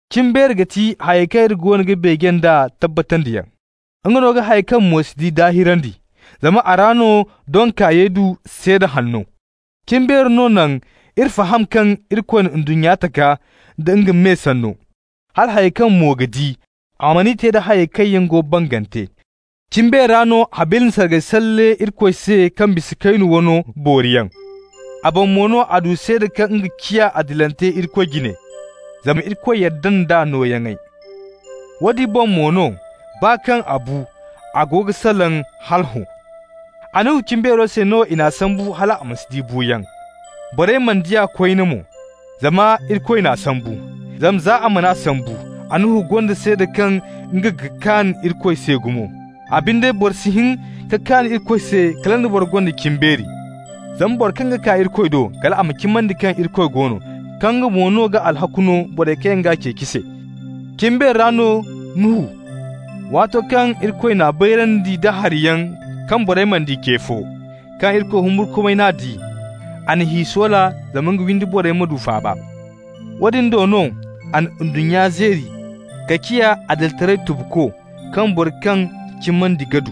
Cimbeeri ga ti hayey kaŋ iri goono ga beeje nd'a tabbatandiyaŋ. Nga no ga hayey kaŋ mo si di daahirandi. Zama a ra no doŋ kaayey du seeda hanno. Cimbeeri no naŋ iri faham kaŋ Irikoy na ndunnya taka nda nga me sanno, hala hayey kaŋ mo ga di, a man'i te da hayey kaŋ yaŋ go bangante. Cimbeeri ra no Habila na sargay salle Irikoy se kaŋ bisa Kaynu wano booriyaŋ. A boŋ mo no a du seeda kaŋ nga ciya adilante Irikoy jine, zama Irikoy yadda nd'a nooyaŋey. Woodin boŋ mo no, baa kaŋ a bu, a go ga salaŋ hala hõ. Annuhu cimbeero se no i n'a sambu hal a ma si di buuyaŋ. Borey mana di a koyne mo, zama Irikoy n'a sambu. Zama za a man'a sambu, Annuhu gonda seeda kaŋ nga ga kaan Irikoy se gumo. A binde boro si hin ka kaan Irikoy se kala nda bora gonda cimbeeri, zama boro kaŋ ga kaa Irikoy do, kal a ma cimandi kaŋ Irikoy go no, kaŋ nga mo no ga alhakku no borey kaŋ ga nga ceeci se. Cimbeeri ra no Nuhu, waato kaŋ Irikoy n'a bayrandi nda hariyaŋ kaŋ borey mana di ce fo, kaŋ Irikoy humburkumay n'a di, a na hi soola zama nga windi borey ma du faaba. Woodin do no a na ndunnya zeeri ka ciya adilitaray tubuko, kaŋ boro kaŋ cimandi ga du.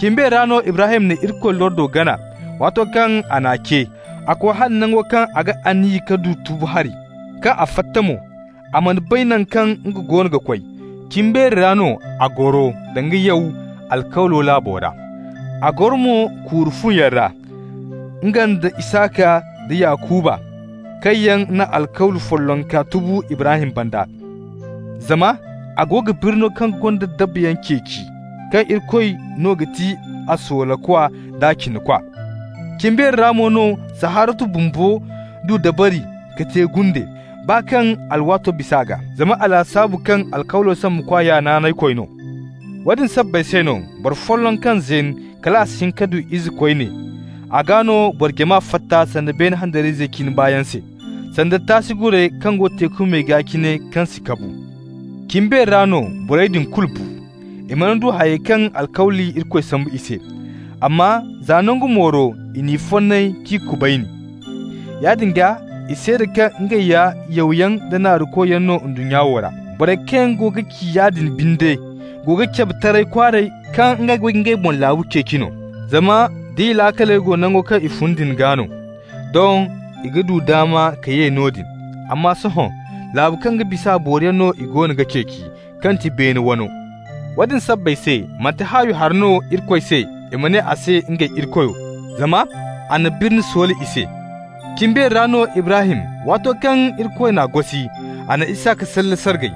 Cimbeeri ra no Ibrahim na Irikoy lordo gana, waato kaŋ a n'a ce. A koy hala nango kaŋ a ga aniya ka du tubu hari. Kaŋ a fatta mo, a mana bay naŋ kaŋ nga go ga koy. Cimbeeri ra no a goro danga yaw alkawlo laabo ra. A goro mo kuuru fuyaŋ ra, nga nda Isaka nda Yakuba, kaŋ yaŋ na alkawli follonka tubu Ibrahim banda. Zama a go ga birno kaŋ gonda dabayaŋ ceeci, kaŋ Irikoy no ga ti a soolakwa d'a cinakwa. Cimbeeri ra mo no Saharatu bumbo du dabari ka te gunde, baa kaŋ alwaato bisa a gaa, zama a lasaabu kaŋ alkawlo sambukwa ya naanaykoy no. Woodin sabbay se no boro folloŋ kaŋ zeen kal a si hin ka du ize koyne, a gaa no boro jama fatta sanda beene handariyayzey cine baayaŋ se, sanda taasi gurey kaŋ go teeku me gaa cine kaŋ si kabu. Cimbeeri ra no borey din kulu bu. I mana du hayey kaŋ alkawli Irikoy sambu i se, amma za nangu mooro i n'i fonnay k'i kubayni. Yaadin gaa i seeda kaŋ ngey ya yawyaŋ da naarukoyaŋ no ndunnya wo ra. Borey kaŋ yaŋ go ga ci yaadin binde go ga cabe taray kwaaray kaŋ ngey go ga ngey boŋ laabu ceeci no. Zama d'i laakaley go nango kaŋ i fun din gaa no, doŋ i ga du daama ka ye noodin. Amma sohõ, laabu kaŋ ga bis'a booriyaŋ no i goono ga ceeci, kaŋ ti beene wano. Woodin sabbay se manti haawi hari no Irikoy se i ma ne a se ngey Irikoyo, zama a na birni soola i se. Cimbeeri ra no Ibrahim, waato kaŋ Irikoy n'a gosi, a na Isaka salle sargay.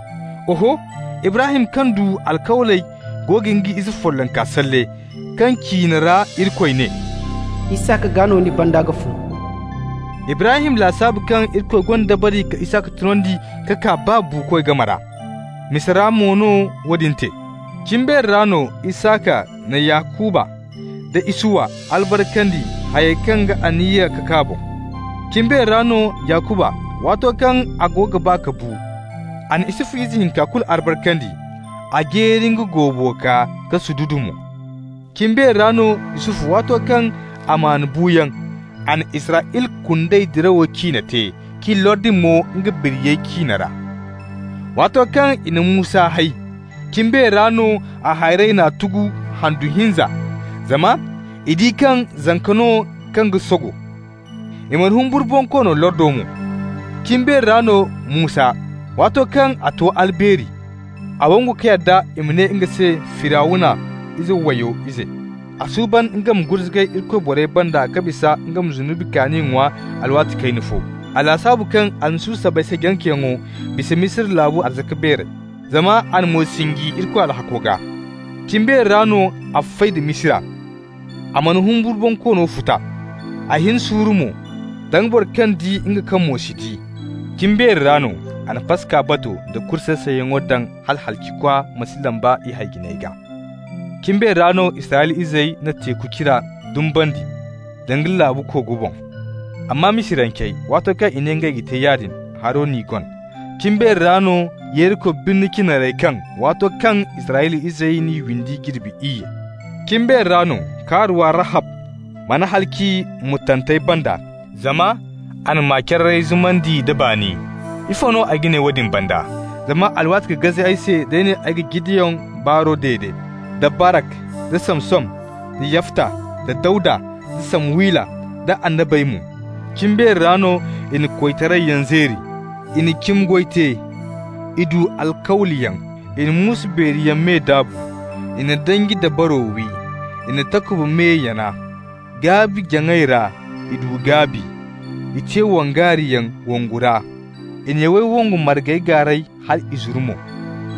Oho, Ibrahim kaŋ du alkawley go ga nga ize follonka salle, kaŋ ciine ra Irikoy ne: «Isaka gaa no ni banda ga fun.» Ibrahim lasaabu kaŋ Irikoy gonda dabari ka Isaka tunandi ka kaa baa buukoy game ra. Misa ra mo no woodin te. Cimbeeri ra no Isaka na Yakuba nda Isuwa albarkandi hayey kaŋ ga aniya ka kaa boŋ. Cimbeeri ra no Yakuba, waato kaŋ a go ga ba ka bu, a na Yusufu ize hinka kulu albarkandi. A jeeri nga goobo gaa ka sududu mo. Cimbeeri ra no Yusufu, waato kaŋ a maan buuyaŋ, a na Israyla kundey dirawo ciine te, k'i lordi mo nga biriyey ciine ra. Waato kaŋ i na Musa hay, cimbeeri ra no a hayrey n'a tugu handu hinza, zama i di kaŋ zanka no kaŋ ga sogo. I mana humburu bonkoono lordo mo. Cimbeeri ra no Musa, waato kaŋ a to albeeri, a wangu ka yadda i ma ne nga se Firawna ize wayo ize. A suuban nga ma gurzugay Irikoy borey banda ka bisa nga ma zunubi kaani ŋwa alwaati kayna fo. A lasaabu kaŋ Almasihu sabbay se janceyaŋo bisa Misira laabu arzaka beeray, zama a na mo sinji Irikoy alhakko gaa. Cimbeeri ra no a fay da Misira, a mana humburu bonkoono futa. A hin suuru mo, danga boro kaŋ di nga kaŋ mo si di. Cimbeeri ra no a na Paska bato da kuri say-sayyaŋo daŋ hala halacikwa ma si lamba i hay-jiney gaa. Cimbeeri ra no Israyla izey na Teeku Cira dumbandi, danga laabu kogo boŋ. Amma Misirancey, waato kaŋ i ne ngey ga te yaadin, haro n'i gon. Cimbeeri ra no Yeriko birni cinarey kaŋ waato kaŋ Israyla izey n'i windi jirbi iyye. Cimbeeri ra no kaaruwa Rahab mana halaci murtantey banda, zama a na ma-cararey zumandi nda baani. Ifo no ay ga ne woodin banda? Zama alwaati ga gaze ay se d'ay ne ay ma Jideyon baaro dede, da Barak, da Samson, da Yafta, da Dawda, da Samuwila, da annabey mo. Cimbeeri ra no i na koytarayyaŋ zeeri, i na cimi goy te, i du alkawliyaŋ, i na muusu beeri yaŋ me daabu. I na danji dabaro wi, i na takuba me yana. Gaabi-jaŋay ra i du gaabi, i te wongaariyaŋ wongu ra, i na yawey wongu margayaŋ gaaray hal i zuru mo.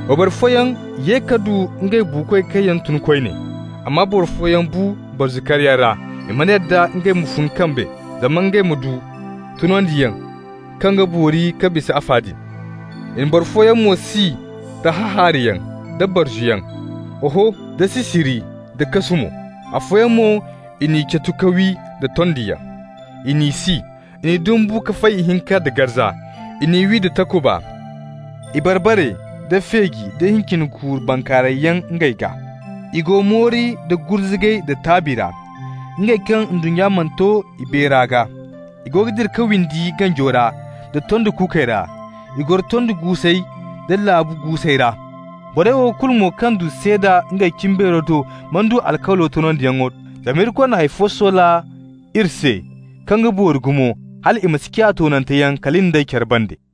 Wayboro fooyaŋ ye ka du ngey buukoy kaŋ yaŋ tun koyne. Amma boro fooyaŋ bu barzu karyaŋ ra, i mana yadda ngey ma fun kambe zama ngey ma du tunandiyaŋ kaŋ ga boori ka bisa afa din. I na boro fooyaŋ mo si da hahaarayaŋ da barzuyaŋ, oho da sisiri nda kasu mo. Afooyaŋ mo i n'i catu ka wi da tondiyaŋ, i n'i si, i n'i dumbu ka fay ihinka nda garza. I n'i wi da takuba. I bar-bare nda feeji nda hincin kuuru bankaarayyaŋ ngey gaa. I go moori nda gurzugay da taabi ra, -- ngey kaŋ ndunnya mana to i beera gaa. -- I go ga dira ka windi ganjo ra da tondi kuukey ra, i goro tondi guusey da laabu guusey ra. Borey wo kulu mo kaŋ du seeda ngey cimbeero do mana du alkawlo toonandiyaŋo, zama Irikoy na hay fo soola iri se kaŋ ga boori gumo hal i ma si ciya toonanteyaŋ kala in d'ey care banda.